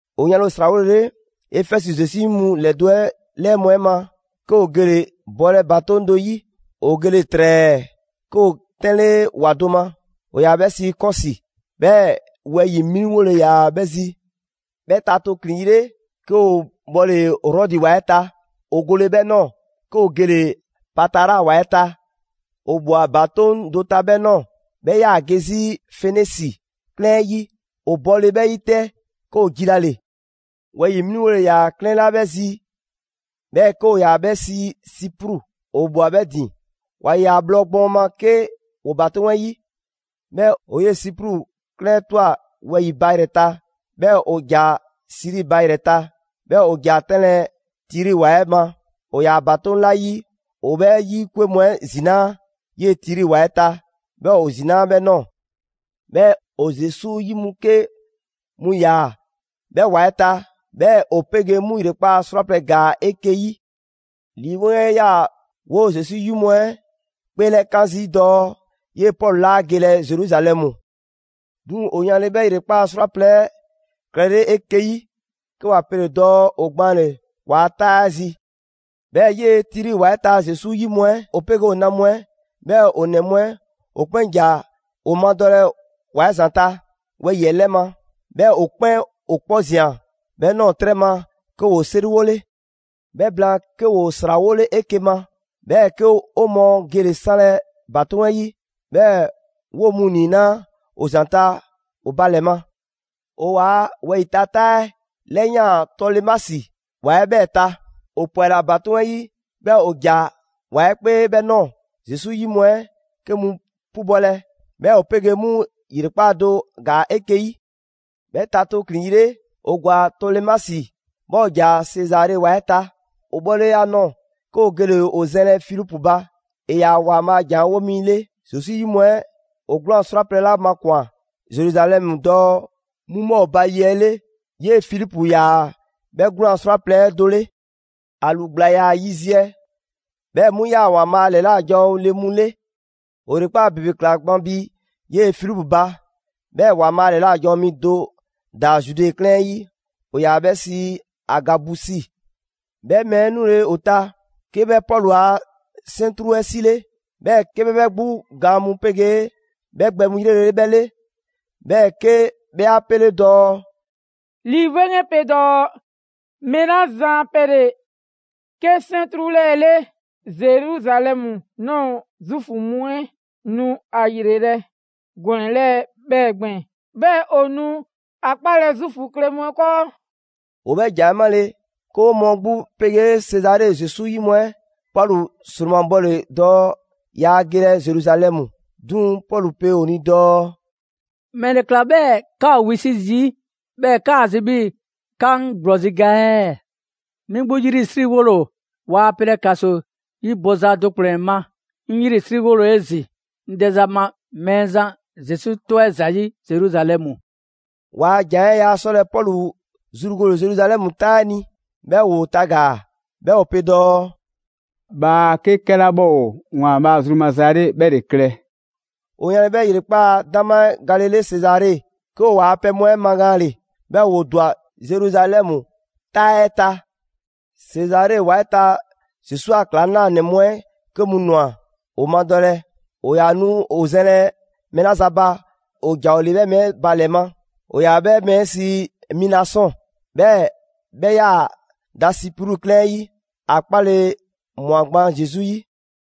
'O 'yanle‑ 'o 'srawolele Efɛzi Zesu 'yi mu ‑lɛdo' 'ɛ ‑lɛɛ mu 'ɛ ma, 'ke 'o gele‑ bɔlɛ ‑batoŋ' do 'yi. 'O gele‑ ‑trɛɛ 'ke 'o 'tɛnle ‑wa do ma, ‑o ‑yaa 'bhɛ sii Kɔsi, 'bhɛɛ‑ wɛyi‑ 'mliŋgole ‑yaa 'bhɛ zi. 'Bhɛ ta tooklin‑ yi 'le, 'ke 'o 'bhɔle Rɔdi ‑wa 'ɛ ta. 'O gole 'bhɛ ꞊nɔɔ, 'ke 'o gele‑ Patara ‑wa 'ɛ ta. 'O ꞊bhwa ‑batoŋ' do ta 'bhɛ ꞊nɔɔ, 'bhɛ 'yaa‑ ge 'zi Fenisi 'klɛɛn 'ɛ 'yi; 'o bɔle 'bhɛ 'yi 'tɛ, 'ke 'o jilale. Wɛyi‑ 'mliŋgole ‑yaa 'klɛɛn 'la 'bhɛ zi 'bhɛɛ‑ 'ke ‑o ‑yaa 'bhɛ sii Sipru, 'o ꞊bhwa 'bhɛ ‑din: 'wa ꞊ya bhlɔ gbɔɔn ma 'ke 'woo‑ ‑batoŋ' 'ɛ 'yi. 'Bhɛɛ‑ 'o 'yee‑ Sipru 'klɛɛn 'ɛ ꞊twa wɛyi‑ ba ‑yrɛ ta, 'bhɛɛ‑ 'o ‑ja Siri ba ‑yrɛ ta, 'bhɛɛ‑ 'o ‑ja 'tɛnlɛ‑ Tiri ‑wa 'ɛ ma. 'O 'yaa‑ ‑batoŋ' 'la 'yi, ‑o 'bhɛ 'yi 'kwe mu 'ɛ ‑zinaa' 'yee‑ Tiri ‑wa 'ɛ ta. 'Bhɛɛ‑ 'o ‑zinaa' 'bhɛ ꞊nɔɔ. 'Bhɛɛ‑ 'o Zesu 'yi mu 'ke mu ꞊ya 'bhɛ ‑wa 'ɛ ta, 'bhɛɛ‑ 'o 'pegee 'mu ‑yrekpaa' 'srwaplɛ‑ ‑gaa 'eke‑ 'yi. Lii 'Weŋ 'ɛ 'yaa‑ 'woo‑ Zesu 'yi mu 'ɛ 'kpeelɛkaan zii' dɔɔ 'yee‑ Pɔlu 'laa gelɛ Zeruzalɛmu. 'Duŋ‑, 'o 'yanle‑ 'bhɛ ‑yrekpaa' 'srwaplɛ‑ 'ɛ klɛlele 'eke‑ 'yi, 'ke 'wa 'pele dɔɔ 'o gbaanle‑ 'waa‑ 'taa 'ɛ zi. 'Bhɛɛ‑ 'yee‑ Tiri ‑wa 'ɛ ta Zesu 'yi mu 'ɛ, ‑o 'pegee ‑o na mu 'ɛ 'bhɛɛ‑ ‑o ‑nɛ mu 'ɛ, ‑o 'kpɛn ‑ja 'o 'madɔlɛ ‑wa 'ɛ ‑zanta' wɛyi‑ 'ɛ 'lɛ ma. 'Bhɛɛ‑ 'o 'kpɛn 'o 'kpɔ ꞊zian 'bhɛ ꞊nɔɔ 'trɛ ma, 'ke 'woo 'seriwole. 'Bhɛ blaan, 'ke 'woo 'srawole 'eke‑ ma 'bhɛɛ‑ 'ke 'o mɔɔ gele‑ 'sanlɛ‑ ‑batoŋ' 'ɛ 'yi; 'bhɛɛ‑ 'woo‑ mu ‑niinaa' ‑o ‑zanta' ‑o ba ‑lɛ ma. 'O 'waa‑ wɛyi‑ ta 'taa 'ɛ 'lɛyaan‑ Tolemasi ‑wa 'ɛ 'bhɛɛ‑ ta. 'O 'pwɛla‑ ‑batoŋ' 'ɛ 'yi, 'bhɛɛ‑ 'o ‑ja ‑wa 'ɛ 'kpee 'bhɛ ꞊nɔɔ Zesu 'yi mu 'ɛ 'ke mu 'pubɔlɛ. 'Bhɛɛ‑ 'o 'pegee 'mu ‑yrekpaa' do ‑gaa 'eke‑ 'yi. 'Bhɛ ta tooklin‑ yi 'le, 'o ‑gwa Tolemasi, 'bhɛɛ‑ 'o ‑ja Sezare ‑wa 'ɛ ta. 'O 'bhɔle‑ ‑a nɔɔ‑, 'ke 'o gele‑ 'o zɛnlɛ Filipu ba; ‑e ‑yaa ‑Waanbhaa' a ‑jan 'ɛ 'wo mi 'le. Zesu 'yi mu 'ɛ ‑o 'gwlaan‑ 'srwaplɛ‑ 'la makwan‑ Zeruzalɛmu dɔɔ 'mu 'bhɔ ‑o ba ye 'ɛ 'le, 'yee‑ Filipu ‑yaa 'bhɛ 'gwlaan‑ 'srwaplɛ‑ 'ɛ do 'le. ‑A ‑lu ‑gbla ‑yaa yiziɛ, 'bhɛɛ‑ 'mu ꞊yaa ‑Waanbhaa' ‑lɛla' janwo le mu 'le. 'O ‑yrekpaa' ‑bebe ꞊kla gban bi 'yee‑ Filipu ba, 'bhɛɛ‑ ‑Waanbhaa' ‑lɛla' janwo mi do ‑daa Zude 'klɛɛn 'ɛ 'yi: ‑o ‑yaa 'bhɛ sii Agabusi. 'Bhɛ mɛɛ 'ɛ 'nule‑ 'o ta, 'ke 'bhɛ Pɔlu a 'sɛntru 'ɛ 'sile, 'bhɛɛ‑ 'ke 'bhɛ 'bhɛ 'gbu gaan mu 'pegee 'bhɛ gbɛ mu ‑yrele' 'bhɛ 'le, 'bhɛɛ‑ 'ke 'bhɛ 'a 'pele dɔɔ: «Lii 'Weŋ 'ɛ pe dɔɔ: ‹Mɛɛ 'la zan a pɛ ‑le 'ke 'sɛntru 'lɛɛ‑ 'le, Zeruzalɛmu ꞊nɔɔ Zuufu mu 'ɛ nu ‑a ‑yrelɛ' gɔnɛ‑ 'lɛɛ‑ 'bhɛɛ‑ gbɛɛn‑. 'Bhɛɛ‑ ‑o nu ‑a 'kpalɛ‑ Zuufu kle mu 'ɛ 'kɔɔ›». 'O 'bhɛ ‑jan 'ɛ 'male‑, 'ke 'o mɔɔ 'gbu 'pegee Sezare Zesu 'yi mu 'ɛ Pɔlu 'sromabɔle dɔɔ yaa gelɛ Zeruzalɛmu. 'Duŋ‑ Pɔlu pe 'o ni dɔɔ: «‑Mɛle ꞊kla 'bhɛɛ‑ 'ka ‑o wisi' zii', 'bhɛɛ‑ 'kaa‑ zi 'bhii‑ 'ka 'ŋ ‑gblɔzi' ga ɛɛ? 'Mi 'gbu 'yrisriwole ‑o, waa pelɛ ‑kaso 'yi bɔza do ‑kplɛn ma, 'ŋ 'yrisriwole ‑o 'ezin‑ 'ŋ dɛza ma Mɛɛzan Zesu 'tɔ 'ɛ ‑zayi' Zeruzalɛmu.» 'Waa‑ ‑jan 'ɛ yaa 'sɔlɛ‑ Pɔlu zru gole Zeruzalɛmu 'taa 'ɛ ni, 'bhɛɛ‑ 'woo tagaa‑. 'Bhɛɛ‑ 'o pe dɔɔ: «Bhaa 'ke 'kɛla 'bhɛ ‑o ‑Waanbhaa' zru maza 'ɛ 'le 'bhɛ ‑le klɛ!» 'O 'yanle‑ 'bhɛ ‑yrekpaa' 'dama 'ɛ galele Sezare, 'ke 'o 'waa‑ pɛ mu 'ɛ magaanle; 'bhɛɛ‑ 'woo ‑dwa Zeruzalɛmu 'taa 'ɛ ta. Sezare ‑wa 'ɛ ta Zesu a ‑klaŋlanɛ mu 'ɛ 'ke mu ꞊nwa 'o 'madɔlɛ, 'o 'yaa‑ nu 'o zɛnlɛ mɛɛ 'la zan ba, ‑o ‑ja 'o 'le 'bhɛ mɛɛ 'ɛ ba ‑lɛ ma: ‑o ‑yaa 'bhɛ mɛɛ 'ɛ sii Minasɔn, 'bhɛɛ‑ 'bhɛ ꞊yaa da Sipru 'klɛɛn 'ɛ 'yi. ‑A 'kpale‑ ꞊mwa gban Zesu 'yi.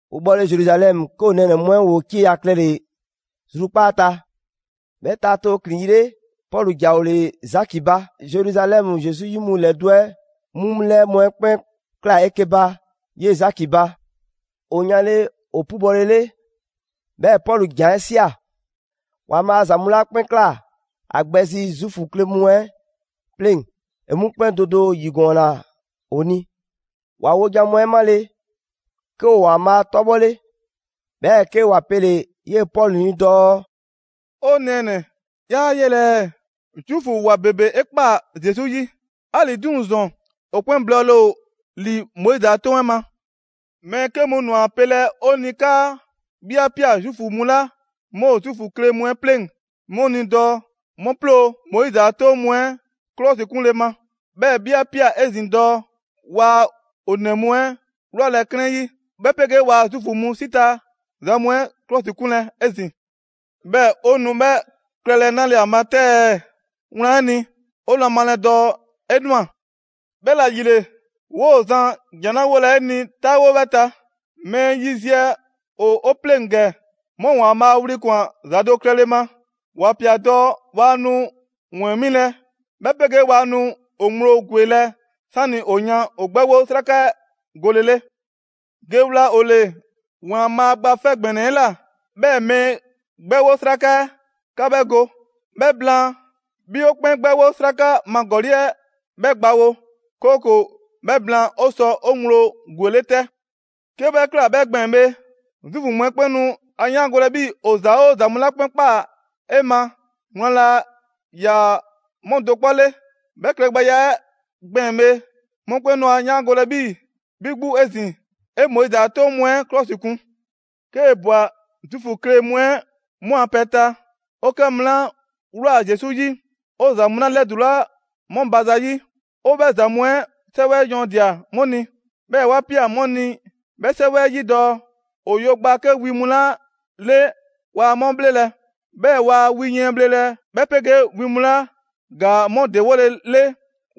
'O 'bhɔle‑ Zeruzalɛmu, 'ke 'o nɛɛnɛ‑ mu 'ɛ ‑woo 'cieya‑ klɛle‑ zrukpaa' ta. 'Bhɛ ta tooklin‑ yi 'le, Pɔlu ‑ja 'o 'le Zaki ba. Zeruzalɛmu Zesu 'yi mu ‑lɛdo' 'ɛ 'mu 'lɛɛ mu 'ɛ 'kpɛn ꞊klaa 'eke‑ ba 'yee‑ Zaki ba. 'O 'yanle‑ ‑o 'pubɔlele, 'bhɛɛ‑ Pɔlu ‑jan 'ɛ ꞊sia. ‑Waanbhaa' ‑za mu 'la 'kpɛn ꞊kla a gbɛ zi Zuufu kle mu 'ɛ 'pleŋ, ‑e 'mu 'kpɛn do do 'yigɔɔnna ‑o ni. ‑Wa wojan mu 'ɛ 'male‑, 'ke ‑o ‑Waanbhaa' 'tɔbhɔle. 'Bhɛɛ‑ 'ke ‑wa pele‑ 'yee‑ Pɔlu ni dɔɔ: «'O nɛɛnɛ‑, 'yaa 'yelɛ‑ ɛɛ, Zuufu 'waa ‑bebe 'e ꞊kpaa Zesu 'yi; 'ali‑ 'duŋ‑ ‑zɔn, ‑o 'kpɛn blɔɔle ‑o ‑li Moizi a 'Toŋ 'ɛ ma. Mɛɛ 'ke mu ꞊nwa ‑a pelɛ ‑o ni 'kaa 'bhi 'a ꞊pia Zuufu mu 'la 'mu ‑o Zuufu kle mu 'ɛ 'pleŋ‑ 'mu ni dɔɔ 'mu 'ploo‑ Moizi 'a 'toŋ mu 'ɛ 'klɔsikunle ma, 'bhɛɛ‑ 'bhi 'a ꞊pia 'ezin‑ dɔɔ waa ‑o ‑nɛ mu 'ɛ 'wlalɛ‑ 'klɛɛn 'yi; 'bhɛ 'pegee waa Zuufu mu 'si ta ‑za mu 'ɛ ‑klɔsikunlɛ 'ezin‑. 'Bhɛɛ‑ 'o nu 'bhɛ klɛlɛ 'nale‑ ‑a ma 'tɛ ɛɛ? Wlan 'ɛ ni, ‑o nu a malɛ dɔɔ 'e ꞊nwa. 'Bhɛla‑ ‑yile, 'woo‑ zan ‑jan 'la 'wolɛ‑ 'e ni 'taawo 'bhɛɛ‑ ta: Mɛɛ yiziɛ ‑o 'o 'pleŋ ‑gɛ, 'mu ‑Waanbhaa' wli ꞊kwan ‑za do klɛle ma (‑wa ꞊pia dɔɔ waa nu ‑wɛɛn 'milɛ‑, 'bhɛ 'pegee waa nu ‑o ŋgblo ‑gwelɛ' 'sani‑ ‑o yan ‑o 'gbɛwo 'sraka 'ɛ golele). Ge wla ‑o ‑le ‑Waanbhaa' Gba 'Fɛ ‑Gbɛnɛ 'ɛ ꞊la, 'bhɛɛ‑ mɛɛ 'gbɛwo 'sraka 'ɛ, ‑ka 'bhɛ go. 'Bhɛ blaan, 'bhi ‑o 'kpɛn 'gbɛwo 'sraka ma ‑gɔli' 'ɛ 'bhɛ gbawo, 'kooko‑ 'bhɛ blaan ‑o sɔ ‑o ŋgblo ‑gwele' 'tɛ. 'Kee 'bhɛ ꞊kla 'bhɛ gbɛɛn‑ bhe, Zuufu mu 'ɛ 'kpɛn nu ‑a 'yaangolɛ 'bhii‑ ‑o ‑za 'oo ‑za mu 'la 'kpɛn ꞊kpaa 'e ma, wlan laa ‑yaa 'mu do 'kpɔ 'le. 'Bhɛ klɛgbɛya 'ɛ gbɛɛn‑ bhe, mɔkpɛn' nu 'a 'yaangolɛ 'bhii‑ 'bhi 'gbu 'ezin‑, 'e Moizi 'a 'toŋ mu 'ɛ 'klɔsikun. 'Kee‑ ꞊bwa Zuufu kle mu 'ɛ 'mu a pɛ ta, ‑o 'kɛ mu 'la ꞊wlaa Zesu 'yi, 'o ‑za mu 'la 'lɛdulaa 'mu ba za 'yi, 'o 'bhɛ ‑za mu 'ɛ 'sɛwɛ yɔɔndia‑ 'mu ni, 'bhɛɛ‑ ‑wa ꞊pia 'mu ni 'bhɛ 'sɛwɛ 'ɛ 'yi dɔɔ: ‑o yo ‑gbaa 'ke wi mu 'la 'le waa 'mu 'bhlelɛ‑, 'bhɛɛ‑ waa wi yiɛn bhlelɛ 'bhɛ 'pegee wi mu 'la ‑gaa 'mu ‑dewolele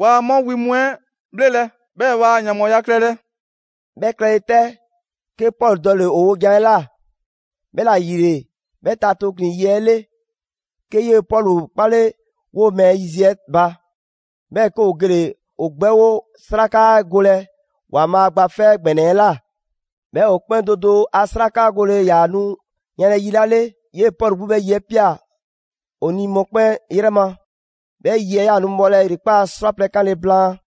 waa 'mu wi mu 'ɛ bhlelɛ; 'bhɛɛ‑ waa ‑yanbhɔɔya klɛlɛ.» 'Bhɛ klɛle 'tɛ, 'ke Pɔlu dɔle‑ ‑o wojan 'ɛ ꞊la. 'Bhɛla‑ ‑yile, 'bhɛ ta tooklin‑ yi 'ɛ 'le, 'ke 'yee‑ Pɔlu 'kpale 'woo‑ mɛɛ yiziɛ ba, 'bhɛɛ‑ 'ke ‑o gele‑ ‑o 'gbɛwo 'sraka 'ɛ golɛ ‑Waanbhaa' Gba 'Fɛ ‑Gbɛnɛ 'ɛ ꞊la. 'Bhɛɛ‑ ‑o 'kpɛn do do a 'sraka gole ‑yaa nu yanlɛ yi 'la 'le, 'yee‑ Pɔlu 'gbu 'bhɛ yi 'ɛ ꞊pia ‑o ni mɔkpɛn' 'yrɛ ma. 'Bhɛ yi 'ɛ 'yaa‑ nu bhɔlɛ ‑yrekpaa' 'srwaplɛ‑ 'kanle‑ blaan.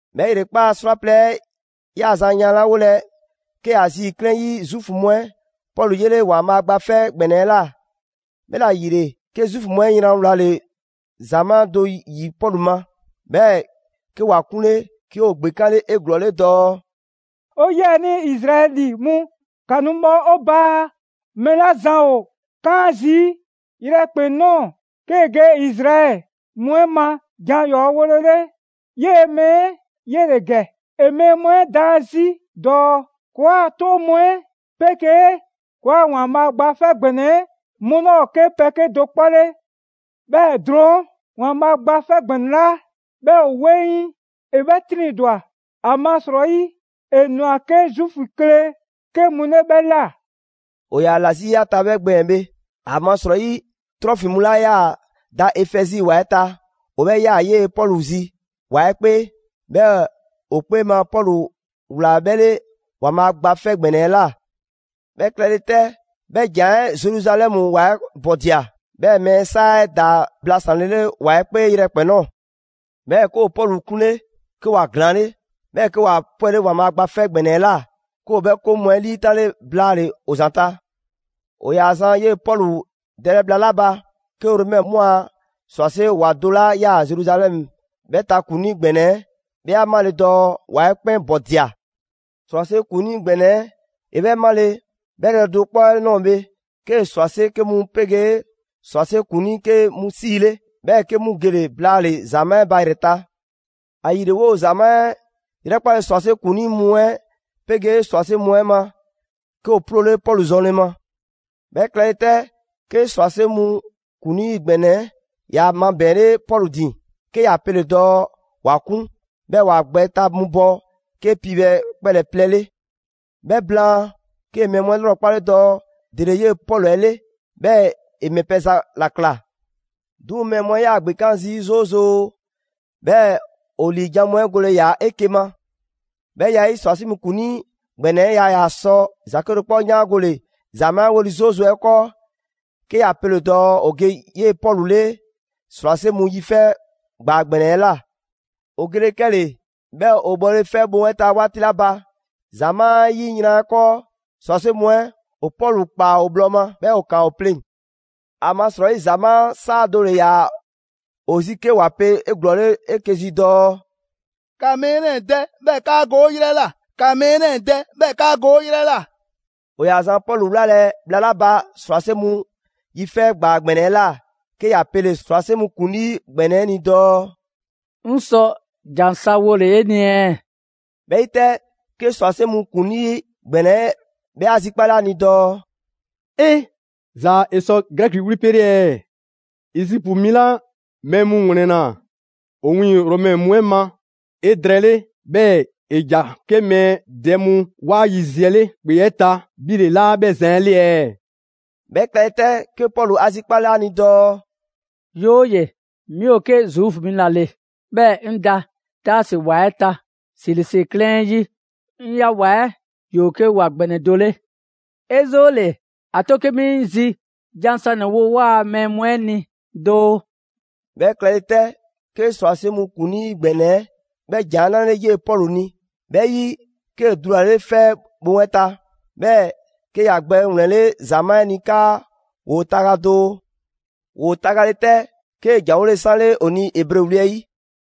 'Bhɛɛ‑ ‑yrekpaa' 'srwaplɛ‑ 'ɛ 'yaa‑ zan 'yanlawolɛ, 'ke Azi 'klɛɛn 'ɛ 'yi Zuufu mu 'ɛ Pɔlu 'yele ‑Waanbhaa' Gba 'Fɛ ‑Gbɛnɛ 'ɛ ꞊la. 'Bhɛla‑ ‑yile, 'ke Zuufu mu 'ɛ yran wlale ‑zamaa' do 'yi Pɔlu ma, 'bhɛɛ‑ 'ke ‑wa 'kunle. 'Ke ‑o ‑gbekanle 'eglɔɔle dɔɔ: «'O 'yiɛnii Izraɛli mu, ‑ka nu bhɔ 'o ba! Mɛɛ 'la zan ‑o 'kaan zii' yrɛkpɛn‑ ꞊nɔɔ 'kee‑ ge Izraɛli mu 'ɛ ma jan ‑yɔɔ' wolele, 'yee‑ mɛɛ 'ɛ 'yele‑ ‑gɛ. ‑E mɛɛ mu 'ɛ daan 'zi dɔɔ ‑kɔɔa' 'toŋ mu 'ɛ 'pegee ‑kɔɔa' ‑Waanbhaa' Gba 'Fɛ ‑Gbɛnɛ 'ɛ 'mu 'laa ‑o 'ke pɛ 'kedo‑ 'kpɔ 'le. 'Bhɛɛ‑ drɔɔn' ‑Waanbhaa' Gba 'Fɛ ‑Gbɛnɛ 'la 'bhɛ ‑o 'weŋ, ‑e 'bhɛ 'triŋdwa‑; ‑amasrɔyi ‑e ꞊nwa 'ke Zuufu kle 'ke mu 'le 'bhɛ ꞊la!» ‑O ‑yaa ‑la 'zi ‑a ta 'bhɛ gbɛɛn‑ bhe, ‑amasrɔyi Trofimu 'la 'yaa‑ da Efɛzi ‑wa 'ɛ ta, ‑o 'bhɛ ꞊ya 'yee‑ Pɔlu zi ‑wa 'ɛ 'kpee. 'Bhɛɛ‑ ‑o 'kpee ma, Pɔlu ‑wlaa 'bhɛ 'le ‑Waanbhaa' Gba 'Fɛ ‑Gbɛnɛ 'ɛ ꞊la. 'Bhɛ klɛle 'tɛ, 'bhɛ ‑jan 'ɛ Zeruzalɛmu ‑wa 'ɛ ‑bɔdia; 'bhɛɛ‑ mɛɛ 'saa 'ɛ ‑daa blasanlele ‑wa 'ɛ 'kpee yrɛkpɛn‑ ꞊nɔɔ. 'Bhɛɛ‑ 'ke ‑o Pɔlu 'kunle, 'ke ‑wa ‑glaanle', 'bhɛɛ‑ 'ke ‑wa 'pwɛle ‑Waanbhaa' Gba 'Fɛ ‑Gbɛnɛ 'ɛ ꞊la. 'Ke ‑o 'bhɛ 'koŋ 'mu 'ɛ 'liitanle blaale‑ ‑o ‑zanta'. ‑O ‑yaa zan 'yee‑ Pɔlu dɛlɛ bhla 'la ba, 'ke Romɛ mu a ‑srwase' ‑wa do 'la 'yaa‑ Zeruzalɛmu 'bhɛ ta ‑kuŋlii ‑gbɛnɛ 'ɛ, 'bhɛ 'a 'male dɔɔ ‑wa 'ɛ 'kpɛn ‑bɔdia. ‑Srwase' ‑kuŋlii ‑gbɛnɛ 'ɛ 'bhɛ 'male‑, 'bhɛ yrɛ do 'kpɔ 'ɛ ꞊nɔɔ bhe, 'kee‑ ‑srwase' 'ke mu 'pegee ‑srwase' ‑kuŋlii 'ke mu 'siile, 'bhɛɛ‑ 'ke 'mu gele‑ blaale‑ ‑zamaa' 'ɛ ba ‑yrɛ ta. ‑Ayile, 'woo‑ ‑zamaa' 'ɛ 'yrɛkpale ‑srwase' ‑kuŋlii mu 'ɛ 'pegee ‑srwase' mu 'ɛ ma, 'ke ‑o 'ploole Pɔlu zɔnle ma. 'Bhɛ klɛle 'tɛ, 'ke ‑srwase' mu ‑kuŋlii ‑gbɛnɛ 'ɛ ‑ya mabɛɛnle Pɔlu ‑din, 'ke ‑ya pele‑ dɔɔ ‑wa 'kun, 'bhɛɛ‑ ‑wa gbɛ ta mu bɔ 'ke piibhɛ kpɛlɛ‑ plɛ 'le. 'Bhɛ blaan, 'kee‑ mɛɛ mu 'ɛ 'lrɔkpale dɔɔ ‑dele 'yee‑ Pɔlu 'ɛ 'le, 'bhɛɛ‑ ‑e ‑mɛ pɛ za ‑la ꞊kla. 'Duŋ‑ mɛɛ mu 'ɛ 'yaa‑ ‑gbekan' zii' 'zoozoo‑; 'bhɛɛ‑ ‑o ‑liijan' mu 'ɛ gole‑ ‑yaa 'eke‑ ma. 'Bhɛ ya 'ɛ 'yi, ‑srwase' mu ‑kuŋlii ‑gbɛnɛ 'ɛ yaa ‑yaa 'sɔle ‑za 'kedo‑ 'kpɔ 'yaangole ‑zamaa' 'ɛ 'weli 'zoozoo‑ 'ɛ 'kɔɔ, 'ke ‑ya pele‑ dɔɔ ‑o ge 'yee‑ Pɔlu 'le ‑srwase' mu yi 'fɛ ‑gbaa ‑gbɛnɛ 'ɛ ꞊la. ‑O gele 'kɛle‑, 'bhɛɛ‑ o bhɔle 'fɛ bhoŋ 'ɛ ta 'waati 'la ba, ‑zamaa' 'ɛ 'yi yran 'ɛ 'kɔɔ, ‑srwase' mu 'ɛ ‑o Pɔlu ‑kpaa ‑o bhlɔ ma, 'bhɛɛ‑ ‑o ‑kaan ‑o pleŋ‑. ‑Amasrɔyi ‑zamaa' 'saa do dɔle ‑yaa ‑o zi 'ke ‑wa pe 'eglɔɔle 'eke‑ zi dɔɔ: «‑Ka mɛɛ 'lɛɛ‑ dɛ, 'bhɛɛ‑ 'kaa go 'o 'yrɛ ꞊la! ‑Ka mɛɛ 'lɛɛ‑ dɛ, 'bhɛɛ‑ 'kaa go 'o 'yrɛ ꞊la!» ‑O ‑yaa zan Pɔlu 'wlalɛ‑ bhla 'la ba ‑srwase' mu yi 'fɛ ‑gbaa ‑gbɛnɛ 'ɛ ꞊la, 'ke ‑ya pele‑ ‑srwase' mu ‑kuŋlii ‑gbɛnɛ 'ɛ ni dɔɔ: «'Ŋ sɔ ‑jan sa wole‑ 'e ni ɛɛ?» 'Bhɛ 'yi 'tɛ, 'ke ‑srwase' mu ‑kuŋlii ‑gbɛnɛ 'ɛ 'bhɛ 'a zikpale ‑a ni dɔɔ: «'E! Zaa‑ 'e sɔ Grɛki wli pele‑ ɛɛ? Ezipu mi 'la mɛɛ mu ‑wlɛnna 'o 'wiiŋ‑ Romɛ mu 'ɛ ma 'edrɛɛle 'bhɛɛ‑ ‑e ‑ja 'ke mɛɛ dɛ mu 'waa yiziɛ 'le ‑kpe 'ɛ ta, 'bhi ‑le 'laa 'bhɛ zan 'ɛ 'le ɛɛ?» 'Bhɛ klɛle 'tɛ, 'ke Pɔlu 'a zikpale 'a ni dɔɔ: «'Yooye‑, 'mi ‑o 'ke Zuufu mi ‑la ‑le, 'bhɛɛ‑ 'ŋ da Taasi ‑wa 'ɛ ta, Silisi 'klɛɛn 'ɛ 'yi: 'ŋ ꞊ya ‑wa 'ɛ ‑yoo 'ke ‑wa ‑gbɛnɛ do 'le. 'E 'zoole‑, ‑a 'to 'ke 'mi 'ŋ zi jan sanɛ‑ wo 'waa‑ mɛɛ mu 'ɛ ni doo.» 'Bhɛ klɛle 'tɛ, 'ke ‑srwase' mu ‑kuŋlii ‑gbɛnɛ 'ɛ 'bhɛ ‑jan 'ɛ 'nale‑ 'yee‑ Pɔlu ni. 'Bhɛ 'yi, 'kee‑ dulale 'fɛ bhoŋ 'ɛ ta, 'bhɛɛ‑ 'ke ‑ya gbɛ ‑wlɛnle' ‑zamaa' 'ɛ ni 'kaa ‑woo taga doo. ‑Woo tagale 'tɛ, 'kee‑ ‑janwole 'sanle ‑o ni Ebre wli 'ɛ 'yi.